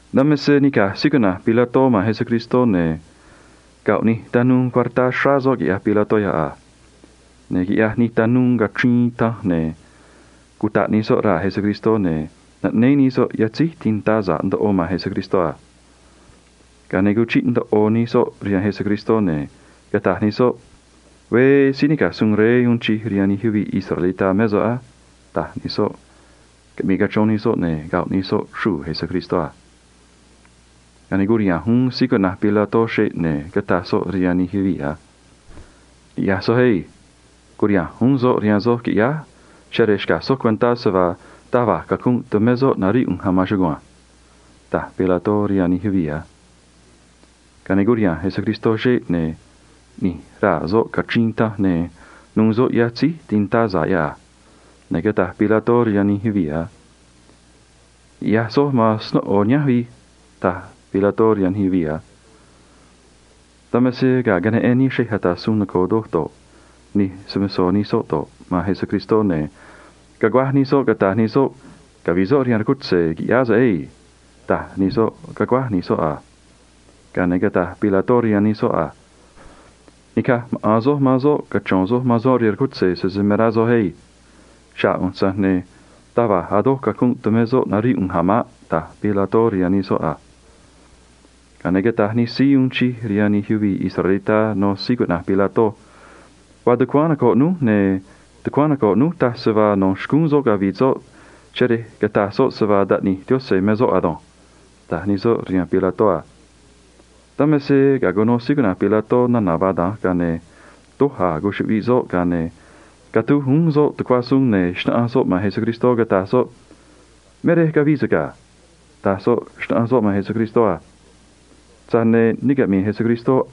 Dan me se nica̱j Pilató man Jesús, ne̱ goꞌ nij tanuu cuartá xráá soꞌ, quiꞌyaj Pilató yoꞌ a. Ne̱ quiꞌyaj nij tanuu cachriin tanj, ne̱ cutaꞌ nij soꞌ raa̱ Jesús, ne̱ naꞌnéé nij soꞌ yatzéj tintá sa̱ꞌ ndoꞌo man Jesús a. Ga̱a ne̱ cuchiꞌ ndoꞌo nij soꞌ rihaan Jesús, ne̱ cataj nij soꞌ a: ―Veé síí nica̱j suun rey uun chij rihaan nij yuvii̱ israelitá mé so̱ꞌ na̱nj á ―taj nij soꞌ, caꞌmii tico nij soꞌ, ne̱ coxro nij soꞌ xruu̱ Jesús a. Ga̱a ne̱ curiha̱nj uún Pilató xeꞌ, ne̱ cataj soꞌ rihaan nij yuvii̱ a: ―Ni̱ꞌyaj soj á. Cu̱riha̱nj uún soꞌ rihaan soj, qui̱ꞌyáj, cheꞌé rej xca̱j soj cuentá se vaa taj va̱j cacunꞌ tumé soꞌ naríꞌ ꞌu̱nj a̱ maan chugua̱nj ―taj Pilató rihaan nij yuvii̱ a. Ga̱a ne̱ curiha̱nj Jesús xeꞌ, ne̱ ꞌni̱j raa̱ soꞌ cachriin tanj, ne̱ nu̱u̱ soꞌ yatzéj tintá sa̱ꞌ yoꞌ a. Ne̱ cataj Pilató rihaan nij yuvii̱ a: ―Ni̱ꞌyaj soj man snóꞌo nihánj vi̱j ―taj Pilató rihaan nij yuvii̱ a. Dan me se ga̱a queneꞌen nij xrej ata̱ suun noco̱o do̱ꞌ, nij tanuu nu̱u̱ rihaan nij soꞌ do̱ꞌ, man Jesús, ne̱ caguáj nij soꞌ, cataj nij soꞌ a: ―Cavi̱ꞌ soꞌ rihaan rcutze̱, qui̱ꞌyáá so̱ꞌ á. Cavi̱ꞌ soꞌ rihaan rcutze̱, qui̱ꞌyáá so̱ꞌ á ―taj nij soꞌ, caguáj nij soꞌ a. Ga̱a ne̱ cataj Pilató rihaan nij soꞌ a: ―Ni̱caj maꞌa̱n soj man soꞌ cachro̱n soj man soꞌ rihaan rcutze̱, sese me rá soj na̱nj á. Xa̱ꞌ ꞌu̱nj, tza̱j ne̱ taj va̱j a̱ doj cacunꞌ tumé soꞌ naríꞌ ꞌu̱nj a̱ maꞌ ―taj Pilató rihaan nij soꞌ a. Ga̱a ne̱ cataj nij síí uun chij rihaan nij yuvii̱ israelitá rihaan Pilató a: ―Vaa tucuáán noco̱ꞌ núj, ne̱ tucuáán noco̱ꞌ núj taj se vaa no̱ xcúún soꞌ cavi̱ꞌ soꞌ, cheꞌé se cataj soꞌ se vaa Taꞌni̱j Yaꞌanj me soꞌ ado̱nj ―taj nij soꞌ rihaan Pilató a. Dan me se ga̱a cuno Pilató nana̱ vaa da̱nj, ga̱a ne̱ doj a̱ cuchuꞌviꞌ soꞌ a. Ga̱a ne̱ catúj uún soꞌ tucuá suun, ne̱ xnáꞌanj soꞌ man Jesús, cataj soꞌ a: ―Me rej cavii so̱ꞌ ga̱ ―taj soꞌ, xnáꞌanj soꞌ man Jesús a. Tza̱j ne̱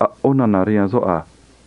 a̱ ꞌó nana̱ ne caꞌmi̱i̱ Jesús rihaan soꞌ a̱ maꞌ.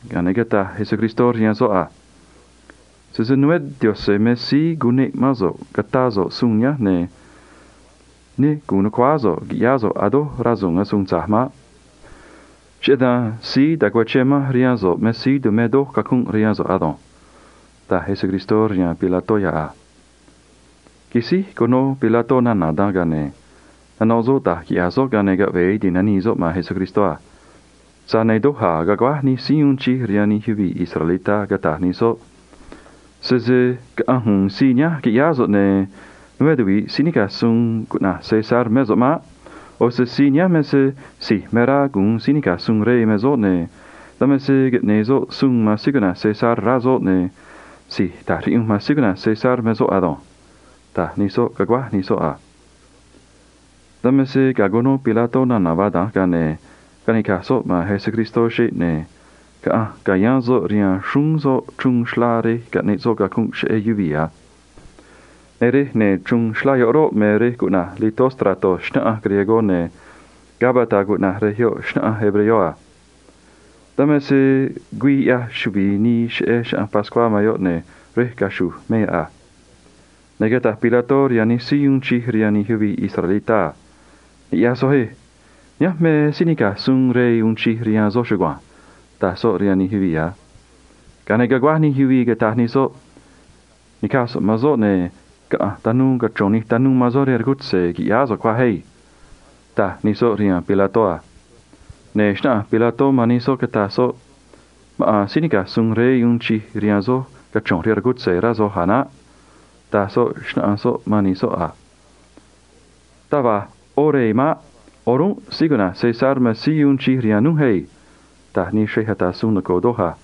Ga̱a ne̱ cataj Jesús rihaan soꞌ a: ―Sese né Yaꞌa̱nj me síí cuneꞌ mán so̱ꞌ ca̱tá so̱ꞌ suun nihánj, ne̱ ne gu̱un nu̱cuáá so̱ꞌ qui̱ꞌyáá so̱ꞌ a̱ doj rasu̱u̱n asuun tza̱j maꞌ. Cheꞌé dan síí tacuachén manj rihaan so̱ꞌ me síí tumé doj cacunꞌ rihaan so̱ꞌ ado̱nj ―taj Jesús rihaan Pilató yoꞌ a. Quisíj cuno Pilató nana̱ caꞌmii soꞌ, ga̱a ne̱ nanoꞌ soꞌ da̱j quiꞌya̱j soꞌ, ga̱a ne̱ caꞌve̱e ti̱nanii soꞌ man Jesús a. Tza̱j ne̱ doj a̱ caguáj nij síí uun chij rihaan nij yuvii̱ israelitá, cataj nij soꞌ a: ―Sese caꞌa̱nj u̱u̱n síí nihánj, qui̱ꞌyáá so̱ꞌ, ne̱ né tuvi̱ꞌ síí nica̱j suun rey cuꞌna̱j César mé so̱ꞌ maꞌ. ꞌO̱ se síí nihánj me se si̱j me rá gu̱un síí nica̱j suun rey me soꞌ, ne̱ dan me se caꞌne̱e̱ soꞌ suun man síí cuꞌna̱j César, rá soꞌ, ne̱ si̱j ta̱j riꞌyunj man síí cuꞌna̱j César me soꞌ ado̱nj ―taj nij soꞌ, caguáj nij soꞌ a. Dan me se ga̱a cuno Pilató nana̱ caꞌmii nij soꞌ, ga̱a ne̱ caꞌanj nica̱j soꞌ man Jesús xeꞌ, ne̱ caꞌanj ca̱yáán soꞌ rihaan xrúún soꞌ chruun xlá rej caꞌneꞌ soꞌ cacunꞌ cheꞌé yuvii̱ a. Ne̱ rej ya̱nj chruun xlá yoꞌ roꞌ, me rej cuꞌna̱j Enlosado, ne̱ Gabata cuꞌna̱j rej yoꞌ xnaꞌánj hebreo a. Dan me se güii ꞌyaj chuvi̱i nii cheꞌé Chaꞌanj Pascuá me yoꞌ, ne̱ rej caxu̱j me yoꞌ a. Ne̱ cataj Pilató rihaan nij síí uun chij rihaan nij yuvii̱ israelitá a: ―Ni̱ꞌyaj soj á. Nihánj me síí nica̱j suun rey uun chij rihaan soj chugua̱nj ―taj soꞌ rihaan nij yuvii̱ a. Ga̱a ne̱ caguáj nij yuvii̱, cataj nij soꞌ a: ―Ni̱caj tanuu man soꞌ, ne̱ caꞌa̱nj cachro̱n tanuu man soꞌ rihaan rcutze̱ cuaj qui̱ꞌyáá so̱ꞌ á ―taj nij soꞌ rihaan Pilató a. Ne̱ xnáꞌanj Pilató man nij soꞌ, cataj soꞌ a: ―Maꞌa̱n síí nica̱j suun rey uun chij rihaan soj cachro̱nj rihaan rcutze̱, rá soj a̱ naꞌ ―taj soꞌ, xnáꞌanj soꞌ man nij soꞌ a. ―Taj va̱j ꞌó rey maꞌ. O̱rúnꞌ síí cuꞌna̱j César me rey uun chij rihaan núj ado̱nj ―taj nij xrej ata̱ suun noco̱o a.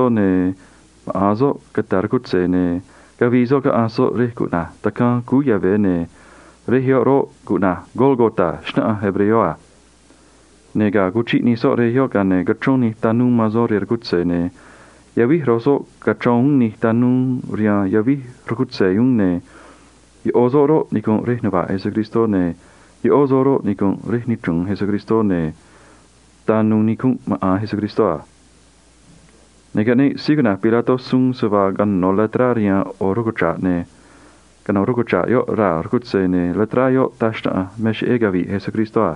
ne̱ maꞌa̱n soꞌ cata̱ rcutze̱, ne̱ cavii soꞌ caꞌanj soꞌ rej cuꞌna̱j Tacaan Cúú Yave̱ Xnangá, ne̱ rej yoꞌ roꞌ, cuꞌna̱j Gólgota xnaꞌánj hebreo a. Ne̱ ga̱a cuchiꞌ nij soꞌ rej yoꞌ, ga̱a ne̱ cachrón nij tanuu man soꞌ rihaan rcutze̱ a. Ne̱ yavíj ro̱j soꞌ cachrón uún nij tanuu rihaan yavíj rcutze̱ uún, ne̱ ꞌo̱ soꞌ roꞌ, nicu̱nꞌ rej nuva̱ꞌ Jesús, ne̱ ꞌó soꞌ roꞌ, nicu̱nꞌ rej nichru̱un Jesús, ne̱ tanu̱u̱ nicunꞌ maꞌa̱n Jesús a. Ne̱ caꞌneꞌ síí cuꞌna̱j Pilató suun, se vaa cano̱ letrá rihaan ꞌo̱ rcuchra̱ꞌ, ne̱ cano̱ rcuchra̱ꞌ yoꞌ raa̱ rcutze̱, ne̱ letrá yoꞌ taj xnaꞌanj me cheꞌé cavi̱ꞌ Jesús a.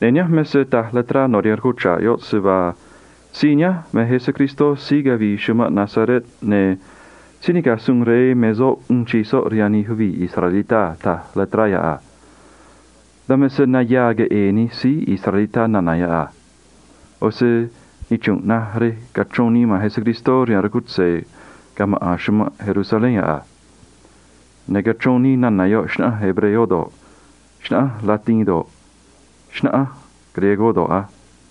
Ne̱ nihánj me se taj letrá no̱ rihaan rcuchra̱ꞌ yoꞌ a: “Síí nihánj me Jesús síí cavii chumanꞌ Nazaret, ne̱ síí nica̱j suun rey uun chij rihaan nij yuvii̱ israelitá me soꞌ a”, taj letrá yoꞌ a. Dan me se nayaa queꞌe̱e̱ nij síí israelitá nana̱ yoꞌ a. ꞌO̱ se nichru̱nꞌ naj rej cachrón nii man Jesús rihaan rcutze̱ ga̱ maꞌa̱n chumanꞌ Jerusalén yoꞌ a. Ne̱ cachrón nii nana̱ yoꞌ xnaꞌánj hebreo do̱ꞌ, xnaꞌánj latín do̱ꞌ, xnaꞌánj griego do̱ꞌ a.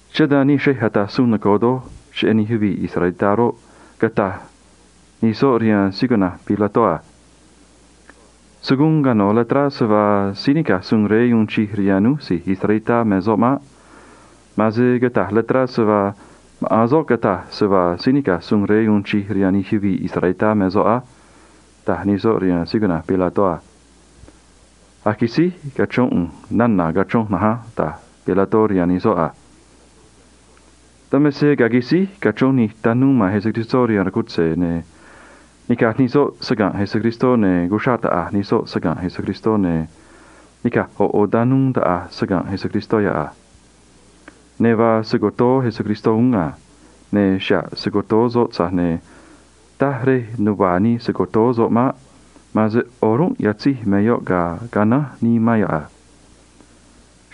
Cheꞌé dan nij xrej ata̱ suun noco̱o rihaan nij yuvii̱ israelitá roꞌ, cataj nij soꞌ rihaan Pilató a: ―Se̱ guun cano̱ letrá se vaa síí nica̱j suun rey uun chij rihaan núj si̱j israelitá me soꞌ maꞌ. Ma̱an se cata̱j letrá se vaa maꞌa̱n soꞌ cataj se vaa síí nica̱j suun rey uun chij rihaan nij yuvii̱ israelitá me soꞌ á ―taj nij soꞌ rihaan Pilató a. ―A̱j quisíj cachrón ꞌu̱nj nana̱ cachronj na̱nj á ―taj Pilató rihaan nij soꞌ a. Dan me se ga̱a quisíj cachrón nij tanuu man Jesús rihaan rcutze̱, ne̱ nica̱j nij soꞌ saga̱nꞌ Jesús, ne̱ cuxraꞌ taꞌa̱j nij soꞌ saga̱nꞌ Jesús, ne̱ nica̱j ꞌo̱ ꞌo̱ tanuu taꞌa̱j saga̱nꞌ Jesús yoꞌ a. Ne̱ vaa se‑co̱toó Jesús cotoó xca̱a̱n uún a. Ne̱ xa̱ꞌ se‑co̱toó soꞌ, tza̱j ne̱ taj va̱j rej nuvá nii se‑co̱toó soꞌ maꞌ. Ma̱an se o̱rúnꞌ yatzéj me yoꞌ ga̱a canánj nii man yoꞌ a.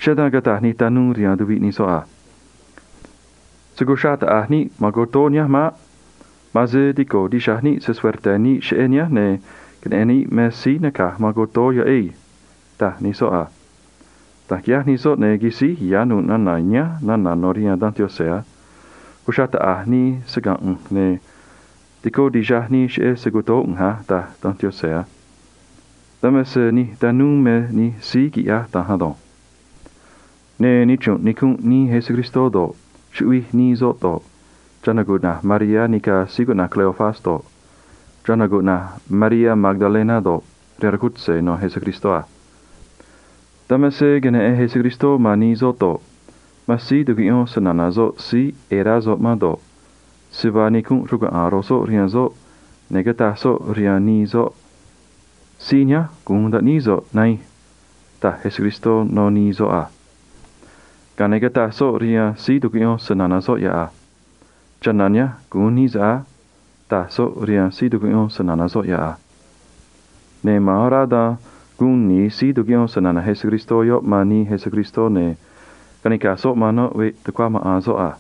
Cheꞌé dan cataj nij tanuu rihaan tuviꞌ nij soꞌ a: ―Se̱ cuxraꞌ taꞌa̱j níꞌ man cotoó nihánj maꞌ. Ma̱an se tico̱ tixaj níꞌ cheꞌé cotoó nihánj, ne̱ queneꞌe̱n níꞌ me síí naca̱j man cotoó yoꞌ á ―taj nij soꞌ a. Da̱nj quiꞌyaj nij soꞌ, ne̱ quisíj ya̱ nu̱ꞌ nana̱ nihánj nana̱ no̱ rihaan Danj Yaꞌanj a: “Cuxraꞌ taꞌa̱j nii saga̱nꞌ ꞌu̱nj, ne̱ tico tixaj nii cheꞌé se‑co̱toó ꞌu̱nj a”, taj Danj Yaꞌanj a. Dan me se nij tanuu me nij síí quiꞌyaj da̱nj ado̱nj. Ne̱ nichru̱nꞌ nicunꞌ nii Jesús do̱ꞌ, chuꞌvij nii soꞌ do̱ꞌ, chana̱ cuꞌna̱j Mariá nica̱ síí cuꞌna̱j Cleofas do̱ꞌ, chana̱ cuꞌna̱j Mariá Magdalena do̱ꞌ, rihaan rcutze̱ no̱ Jesús a. Dan me se queneꞌen Jesús man nii soꞌ do̱ꞌ, man síí tucuꞌyón snana̱ soꞌ síí ꞌe̱e̱ rá soꞌ man do̱ꞌ, se vaa nicunꞌ rcuaꞌa̱a̱n ro̱j soꞌ rihaan soꞌ, ne̱ cataj soꞌ rihaan nii soꞌ a: ―Síí nihánj gu̱un taꞌníí so̱ꞌ, nahiin ―taj Jesús rihaan nii soꞌ a. Ga̱a ne̱ cataj soꞌ rihaan síí tucuꞌyón snana̱ soꞌ yoꞌ a: ―Chana̱ nihánj gu̱un nií so̱ꞌ á ―taj soꞌ rihaan síí tucuꞌyón snana̱ soꞌ yoꞌ a. Ne̱ ma̱an orá dan guun ni̱i síí tucuꞌyón snana̱ Jesús yoꞌ man nii Jesús, ne̱ caꞌanj nica̱j soꞌ man noꞌ veꞌ tucuá maꞌa̱n soꞌ a.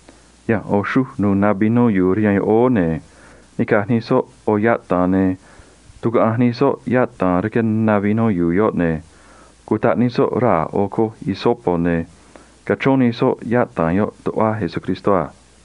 Ya̱nj ꞌo̱ xruj nu̱u̱ na vinó yu̱u̱ rihaan yoꞌóó, ne̱ nica̱j nij soꞌ ꞌo̱ yataa̱n, ne̱ tucuaꞌanj nij soꞌ yataa̱n rque na vinó yu̱u̱ yoꞌ, ne̱ cutaꞌ nij soꞌ raa̱ ꞌo̱ coj hisopo, ne̱ cachrón nij soꞌ yataa̱n yoꞌ tuꞌva Jesús a.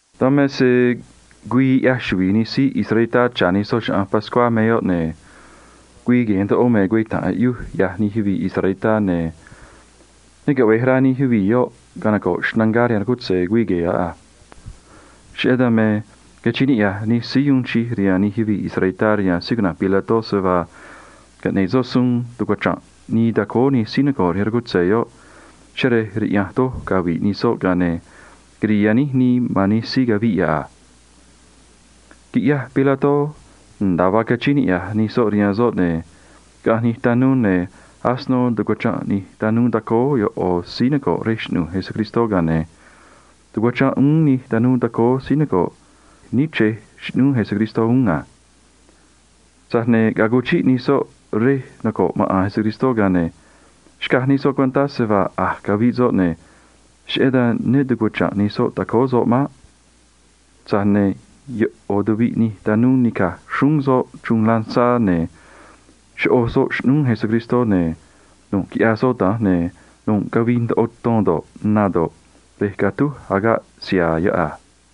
Dan me se güii ꞌyaj chuvi̱i nij síí israelitá cha̱ nij soꞌ Chaꞌanj Pascuá me yoꞌ a. Ne̱ güii gue̱e̱ ndoꞌo rihaan nij yuvii̱ israelitá me cueta̱nꞌ aꞌyuj, ne̱ ne caꞌve̱j rá nij yuvii̱ yoꞌ canoco̱ꞌ xnangá rihaan rcutze̱ güii gue̱e̱ yoꞌ a. Cheꞌé dan me cachíín niꞌya̱j nij síí uun chij rihaan nij yuvii̱ israelitá rihaan síí cuꞌna̱j Pilató se vaa caꞌne̱ꞌ soꞌ suun tucuachra̱nꞌ nii tacóó nij síí noco̱ꞌ rihaan rcutze̱ yoꞌ cheꞌé rej raꞌya̱nj doj cavi̱ꞌ nij soꞌ, ga̱a ne̱ quiri̱i̱ yaníj nii man nij síí caviꞌ yoꞌ a. Quiꞌyaj Pilató nda̱a vaa cachíín niꞌya̱j nij soꞌ rihaan soꞌ, ne̱ caꞌanj nij tanuu, ne̱ asino tucuachranꞌ nij tanuu tacóó ꞌo̱ síí noco̱ꞌ rej xꞌnu̱j Jesús a. Ga̱a ne̱ tucuachranꞌ uún nij tanuu tacóó síí noco̱ꞌ níchrej xꞌnúú Jesús a. Tza̱j ne̱ ga̱a cuchiꞌ nij soꞌ rej noco̱ꞌ maꞌa̱n Jesús, ga̱a ne̱ xcaj nij soꞌ cuentá se vaa a̱j caviꞌ soꞌ, ne̱ cheꞌé dan ne tucuachra̱nꞌ nij soꞌ tacóó soꞌ maꞌ. Tza̱j ne̱ ꞌo̱ nij tanuu nica̱j xrúún soꞌ chruun ta̱j agaꞌ siha̱a̱ raa̱, ne̱ choꞌoj soꞌ xꞌnúú Jesús a. Ne̱ nu̱ꞌ quiꞌyaj soꞌ da̱nj, ne̱ nu̱ꞌ cavii ndoꞌo ton do̱ꞌ, na do̱ꞌ, rej catúj agaꞌ siha̱a̱ yoꞌ a.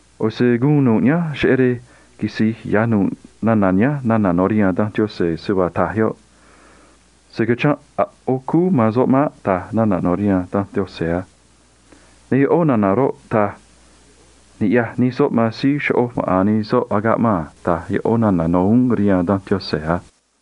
ꞌO̱ se guun nu̱ꞌ nihánj cheꞌé rej quisi̱j ya̱ nu̱ꞌ nana̱ nihánj nana̱ no̱ rihaan Danj Yaꞌanj, se vaa taj yoꞌ a: “Se̱ cachranꞌ a̱ ꞌó cúú man soꞌ maꞌ”, taj nana̱ no̱ rihaan Danj Yaꞌanj a. Ne̱ ꞌó nana̱ roꞌ, taj a: “Ni̱ꞌyaj nij soꞌ man síí choꞌoj maꞌa̱n nij soꞌ agaꞌ man a”, taj ꞌó nana̱ no̱ rihaan Danj Yaꞌanj uún a.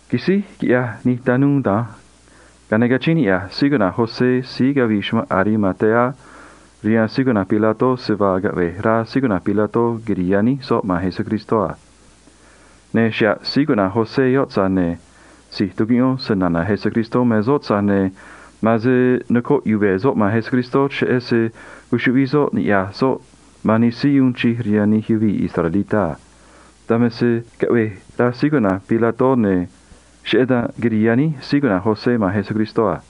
Quisíj quiꞌyaj nij tanuu da̱nj, ga̱a ne̱ cachíín niꞌya̱j síí cuꞌna̱j José síí cavii chumanꞌ Arimatea rihaan síí cuꞌna̱j Pilató se vaa caꞌve̱j rá Pilató quiri̱i̱ yaníj soꞌ cúú man Jesús a. Ne̱ xa̱ꞌ José, tza̱j ne̱ si̱j tucuꞌyón snana̱ Jesús me soꞌ, tza̱j ne̱ ma̱an se nocoꞌ yuve̱ soꞌ man Jesús, cheꞌé se cuchuꞌviꞌ soꞌ niꞌya̱j soꞌ man nij síí uun chij rihaan nij yuvii̱ israelitá a. Dan me se caꞌvej rá Pilató, ne̱ cheꞌé dan quirii yaníj José cúú man Jesús a.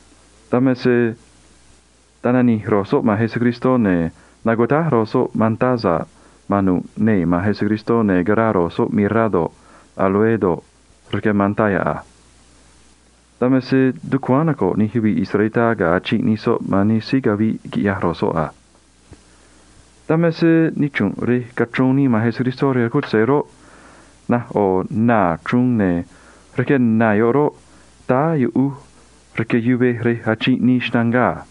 Dan me se tananij ro̱j soꞌ man Jesús, ne̱ nucutáj ro̱j soꞌ mantá sa̱ꞌ man nu̱ꞌ cúú man Jesús, ne̱ caraa ro̱j soꞌ “mirra” do̱ꞌ, áloe do̱ꞌ, rque mantá yoꞌ a. Dan me se tucuáán noco̱ꞌ nij yuvii̱ israelitá ga̱a achinꞌ nij soꞌ man nij síí caviꞌ quiꞌyaj ro̱j soꞌ a. Dan me se nichru̱nꞌ rej cachrón nii man Jesús rihaan rcutze̱ roꞌ, naj ꞌo̱ naa̱ chruun, ne̱ rque naa̱ yoꞌ roꞌ, táá yuꞌuj rque yuvej rej achinꞌ nii xnangá a.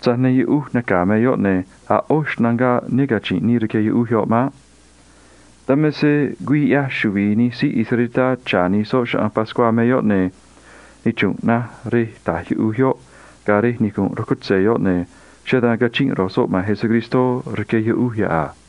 Tza̱j ne̱ yuꞌuj naca̱ me yoꞌ, ne̱ a̱ ꞌó xnangá ne cachi̱nꞌ nii rque yuꞌuj yoꞌ maꞌ. Dan me se güii ꞌyaj chuvi̱i nij síí israelitá cha̱ nij soꞌ Chaꞌanj Pascuá me yoꞌ, ne̱ nichru̱nꞌ naj rej ta̱j yuꞌuj yoꞌ ga̱ rej nicu̱nꞌ rcutze̱ yoꞌ, ne̱ cheꞌé dan cachinꞌ ro̱j soꞌ man Jesús rque yuꞌuj yoꞌ a.